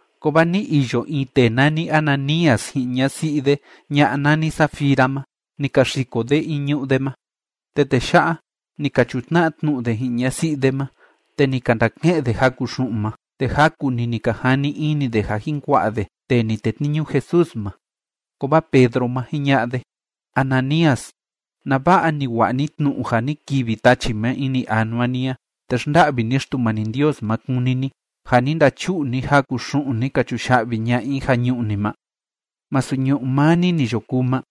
Kovaa ni iyo in tee nani Ananías ji'in ñasi'i de ña'a nani Safira ma. Ni ka xiko de in ñu'ú de ma. Te tee ya'a, ni ka chutna'a tnu'u de ji'in ñasi'i de ma, te ni ka ndake'en de jaku xu'un ma. Te jaku‑ni ni ka jani ini de ja jin kua'a de tee ni tetniñu Jesús ma. Kovaa Pedro ma, jiña'a de: ―Ananías, ¿nava'a ni wa'a ni tnu'u ja ni kivi tachi ma ini anua ni a te xnda'vi ni Xtumani Ndios ma kúni ni, ja ni ndachu'u ni jaku xu'un ni ka chuya'vi ña'a i ja ñu'ú ni ma? ¿Masu ñu'ú maa ni ni yo kuu ma?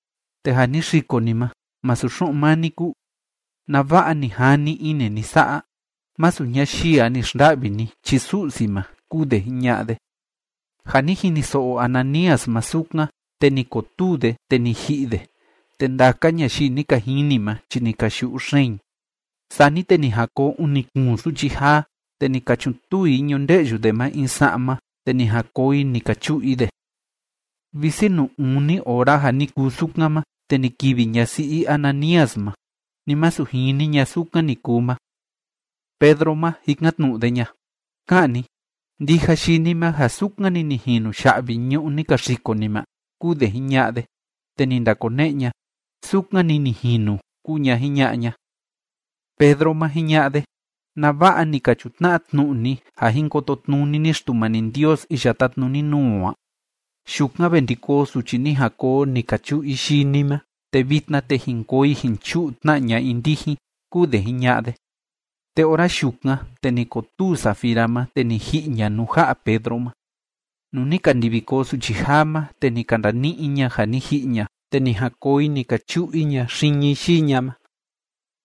Te ja ni xiko ni ma, ¿masu xu'un maa ni kúu? ¿Nava'a ni jani ini ni sa'a? Masu ñayii a ni xnda'vi ni chi Su'si ma ―kúu de jiña'a de. Ja ni jiniso'o Ananías ma sukan, te ni kotuu de, te ni ji'i de. Te ndaka ñayii ni ka jini ma chi ni ka yu'u xeen i. Sani te ni jan koo uni kuun suchi jaa, te ni ka chutuu i ñunde'yu de ma in sa'ma, te ni jan koo i ni ka chu'u i de. Visi nuu uni ora ja ni kuu sukan ma, te ni kivi ñasi'i Ananías ma. Ni masu jini ña sukan ni kuu ma. Pedro ma, jikan‑tnu'u de ña: ―Ka'an ni, ¿ndija yii ni ma ja sukan‑ni ni jinu ya'vi ñu'ú ni ka xiko ni ma? ―kúu de jiña'a de. Te ni ndakone'e ña: ―Sukan‑ni ni jinu ―kúu ña jiña'a ña. Pedro ma, jiña'a de: ―¿Nava'a ni ka chutna'a tnu'u ni ja jin kototnuni ni Xtumani Ndios iya tátnuni nuu o a? Yukan ve ndi koo suchi ni jan koo ni ka chu'u i yii ni ma. Te vitna, te jin koo i jin chu'u tna ña'a i ndijin ―kúu de jiña'a de. Te ora yukan, te ni kotuu Safira ma, te ni ji'i ña nuu ja'a Pedro ma. Nuu ni ka ndivi koo suchi jaa ma, te ni ka ndani'i i ña ja ni ji'i ña. Te ni jan koo i ni ka chu'u i ña xiñi yii ña ma.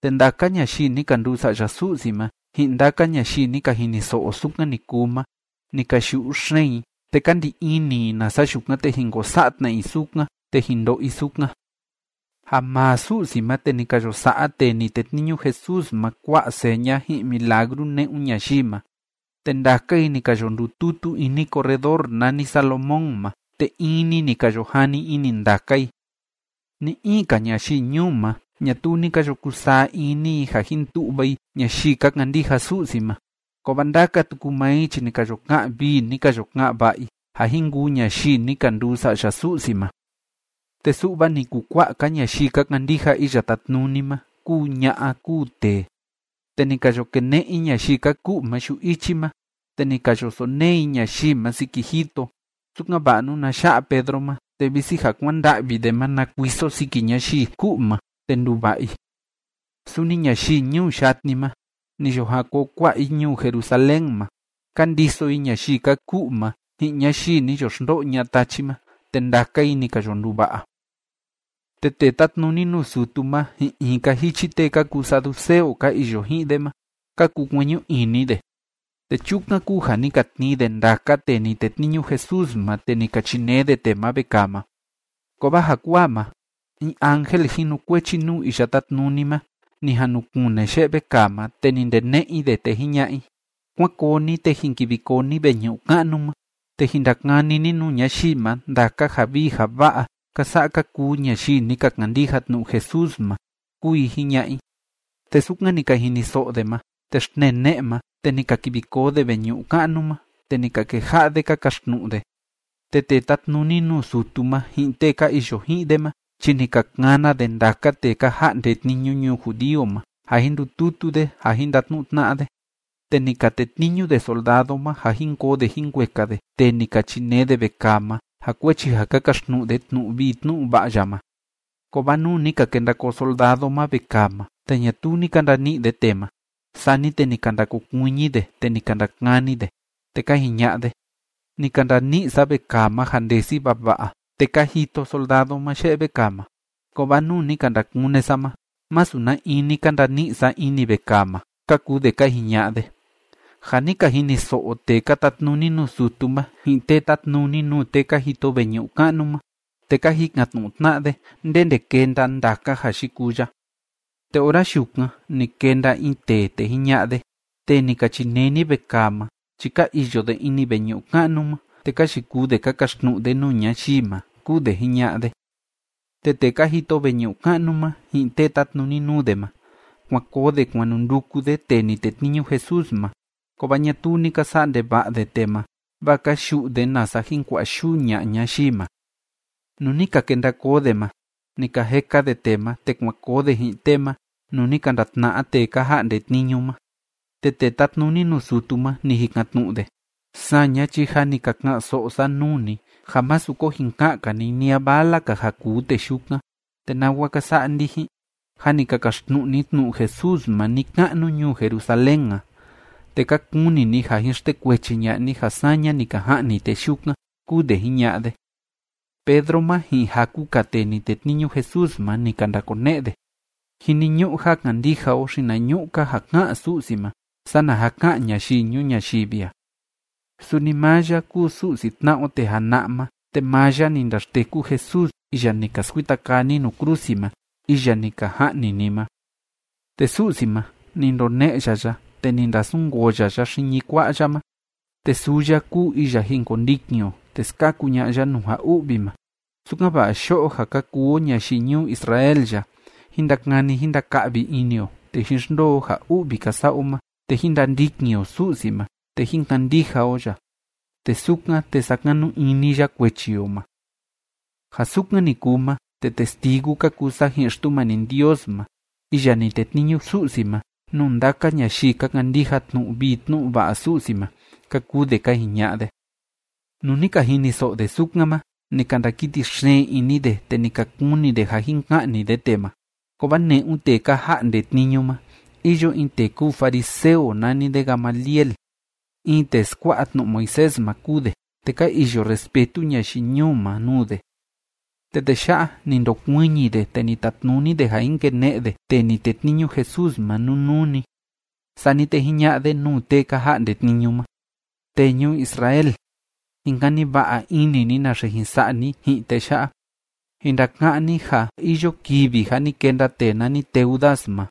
Te ndaka ñayii ni ka nduu sa'ya Su'si ma, ji'in ndaka ñayii ni ka jiniso'o sukan ni kuu ma, ni ka yu'u xeen i, te ka ndi ini i nasa yukan, te jin ko sa'a tna i sukan te jin ndo'o i sukan. Ja maa Su'si ma, te ni ka yo sa'a tee ni tetniñu Jesús ma kua'a seña ji'in milagru ne'un ñayii ma. Te ndaka i ni ka yo ndututu ini corredor nani Salomón ma, te in‑ni ni ka yo jani ini ndaka i. Ni‑in‑ka ñayii ñuu ma, ñatuu ni ka yo kusaa ini i ja jin tu'va i ñayii ka kandija Su'si ma, kovaa ndaka tuku maa i chi ni ka yo ka'an vii, ni ka yo ka'an va'a i ja jin kuu ñayii ni ka nduu sa'ya Su'si ma. Te su'va ni kukua'a‑ka ñayii ka kandija Iya Tátnuni ma kúu ña'a kúu tee. Te ni ka yo kene'e i ñayii ka ku'u ma yu'u ichi ma, te ni ka yo sonee i ñayii ma siki jito, sukan‑va'a nuna ya'a Pedro ma, te visi ja kuanda'vi de ma na kuiso siki ñayii ku'u ma, te nduva'a i. Suni ñayii ñuu yatni ma, ni yo jan koo kua'a i ñuu Jerusalén ma, ka ndiso i ñayii ka ku'u ma ji'in ñayii ni yo xndo'o ña'a tachi ma, te ndaka i ni ka yo nduva'a. Te tee tátnuni nuu sutu ma, ji'in in‑ka jichi tee ka kuu saduceo ka iyo ji'in de ma, ka kukueñu ini de. Te chukan kúu ja ni ka tnii de ndaka tee ni tetniñu Jesús ma, te ni ka chinee de tee ma vekaa ma. Kovaa jakuaa ma, in ángel jinukuechi nuu Iya Tátnuni ma ni jan nu kune ye'e vekaa ma, te ni ndene'e i de, te jiña'a i: ―Kuán koo ni, te jin kivi koo ni veñu'u ka'nu ma, te jin ndakani ni nuu ñayii ma ndaka ja vii ja va'a ka sa'a ka kuu ñayii ni ka kandija tnu'u Jesús ma ―kúu i jiña'a i. Te sukan ni ka jiniso'o de ma, te xtnee ne'e ma, te ni ka kivi koo de veñu'u ka'nu ma, te ni ka keja'a de ka kaxtnu'u de. Te tee tátnuni nuu sutu ma ji'in tee ka iyo ji'in de ma chi ni ka kana de ndaka tee ka ja'nde tniñu ñuu judío ma, ja jin ndututu de ja jin ndatnu'u tna'a de, te ni ka tetniñu de soldado ma ja jin koo de jin kueka de tee ni ka chinee de vekaa ma ja kuechi ja ka kaxtnu'u de tnu'u vii tnu'u va'a ya ma. Kovaa nuu ni ka kenda koo soldado ma vekaa ma, te ñatuu ni ka ndani'i de tee ma, sani te ni ka ndakokuiñi de, te ni ka ndakani de, te ka jiña'a de: ―Ni ka ndani'i sa vekaa ma ja ndesi vava'a, te ka jito soldado ma ye'e vekaa ma. Kovaa nuu ni ka ndakune sa ma, masu na in ni ka ndani'i sa ini vekaa ma ―ka kuu de ka jiña'a de. Ja ni ka jiniso'o tee ka tatnuni nuu sutu ma, ji'in tee tátnuni nuu tee ka jito veñu'u ka'nu ma, te ka jikan‑tnu'u tna'a de ndende kenda ndaka ja yikuu ya. Te ora yukan ni kenda in tee, te jiña'a de: ―Tee ni ka chinee ni vekaa ma chi ka iyo de ini veñu'u ka'nu ma, te ka yikuu de ka kaxtnu'u de nuu ñayii ma ―kúu de jiña'a de. Te tee ka jito veñu'u ka'nu ma ji'in tee tátnuni nuu de ma, kuan koo de kuan nu nduku de tee ni tetniñu Jesús ma. Kovaa ñatuu ni ka sa'a ndeva'a de tee ma, vaa ka yu'u de, nasa jin kua'a yuu ña'a ñayii ma. Nuu ni ka kenda koo de ma, ni ka jeka de tee ma, te kuan koo de ji'in tee ma nuu ni ka ndatna'a tee ka ja'nde tniñu ma. Te tee tátnuni nuu sutu ma, ni jikan‑tnu'u de: ―Saña chi jâ ni ka ka'an‑so'o sa nuu ni ja másu ko jin ka'an‑ka ni ni a vala‑ka ja kuu tee yukan, te ¿nawa ka sa'a ndijin? Jâ ni ka kaxtnu'u ni tnu'u Jesús ma ni‑ka'nu ñuu Jerusalén a, te ka kuni ni ja jin xtekuechi ña'a ni ja saña ni ka ja'ni tee yukan ―kúu de jiña'a de. Pedro ma ji'in jaku‑ka tee ni tetniñu Jesús ma, ni ka ndakone'e de: ―Jiniñu'u ja kandija o xinañu'u‑ka ja ká'an Su'si ma sana ja ká'an ñayii ñuu ñayivi a. Suni maa ya kúu Su'si tna'a o tee jana'a ma, te maa ya ni ndaxteku Jesús iya ni ka skuita kaa ni nuu krusi ma, iya ni ka ja'ni ni ma. Te Su'si ma, ni ndone'e ya ya, te ni ndasunkoo ya ya xiñi kua'a ya ma. Te suu ya kúu iya jin kondikin o, te skaku ña'a ya nuu ja u'vi ma, sukan‑va'a yo'o ja ka kuu o ñayii ñuu Israel ya, jín ndakani jín ndaka'vi ini o, te jín xndoo o ja u'vi ka sa'a o ma, te jín ndandikin o Su'si ma, te jín kandija o ya, te sukan, te sakanu ini ya kuechi o ma. Ja sukan ni kuu ma, te testigu ka kuu sa ji'in Xtumani Ndios ma iya ni tetniñu Su'si ma nuu ndaka ñayii ka kandija tnu'u vii tnu'u va'a Su'si ma ―ka kuu de ka jiña'a de. Nuu ni ka jiniso'o de sukan ma, ni ka ndakiti xeen ini de, te ni ka kuni de ja jin ka'ni de tee ma. Kovaa ne'un tee ka ja'nde tniñu ma iyo in tee kúu fariseo nani de Gamaliel. In tee skua'a tnu'u Moisés ma kúu de, te ka iyo respetu ñayii ñuu ma nuu de. Te tee ya'a, ni ndokuiñi de, te ni tatnuni de ja jin kene'e de tee ni tetniñu Jesús ma nunuu‑ni. Sani te jiña'a de nuu tee ka ja'nde tniñu ma: ―Tee ñuu Israel, jin kani va'a ini ni naxe jin sa'a ni ji'in tee ya'a. Jin ndaka'án ni ja iyo kivi ja ni kenda tee nani Teudas ma,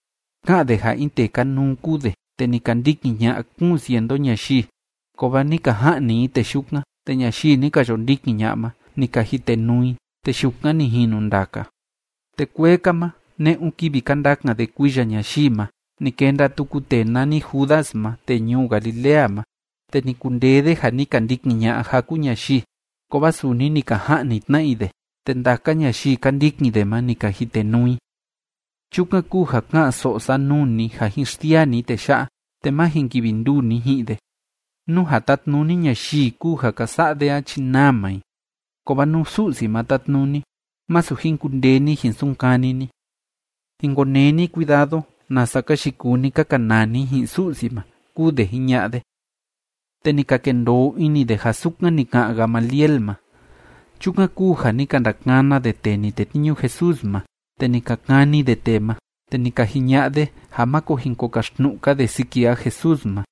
ká'an de ja in tee kanuu kúu de, te ni ka ndikin ña'a kuun cientu ñayii. Kovaa ni ka ja'ni i tee yukan, te ñayii ni ka yo ndikin ña'a ma, ni ka jitenuu i, te yukan ni jinu ndaka. Te kuee‑ka ma, ne'un kivi ka ndakan de kuiya ñayii ma, ni kenda tuku tee nani Judas ma tee ñuu Galilea ma, te ni kundee de ja ni ka ndikin ña'a jaku ñayii. Kovaa suni ni ka ja'ni tna i de, te ndaka ñayii ka ndikin de ma, ni ka jitenuu i. Chukan kúu ja ká'an‑so'o sa nuu ni ja jin xsiaa ni tee ya'a, te má jin kivi nduu ni ji'in de. Nú ja tátnuni ñayii kúu ja ka sa'a de a chi naa maa i. Kovaa nú Su'si ma tátnuni, masu jin kundee ni jin sunkani ni. Jin konee ni cuidado, nasa ka yikuu ni ka kanaa ni ji'in Su'si ma ―kúu de jiña'a de. Te ni ka kendoo ini de ja sukan ni ka'an Gamaliel ma. Chukan kúu ja ni ka ndakana de tee ni tetniñu Jesús ma, te ni ka kani de tee ma, te ni ka jiña'a de ja máko jin ko kaxtnu'u‑ka de siki ja Jesús ma.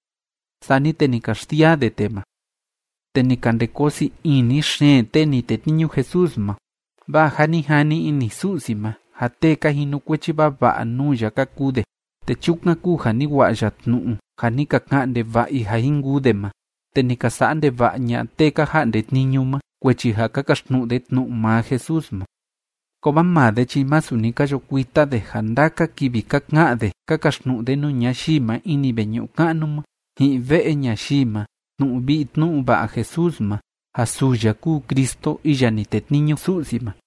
Sani te ni ka xsiaa de tee ma. Te ni ka nde koo sii ini xeen tee ni tetniñu Jesús ma, vaa jâ ni jani ini Su'si ma ja tee ka jinukuechi vava'a nuu ya ka kuu de, te chukan kúu ja ni wa'a ya tnu'u ja ni ka ka'an ndeva'a i ja jin kuu de ma te ni ka sa'a ndeva'a ña'a tee ka ja'nde tniñu ma kuechi ja ka kaxtnu'u de tnu'u maa Jesús ma. Kovaa maa de chi masu ni ka yo kuita de ja ndaka kivi ka ka'an de ka kaxtnu'u de nuu ñayii ma ini veñu'u ka'nu ma ji'in ve'e ñayii ma tnu'u vii tnu'u va'a Jesús ma ja suu ya kúu Cristo iya ni tetniñu Su'si ma.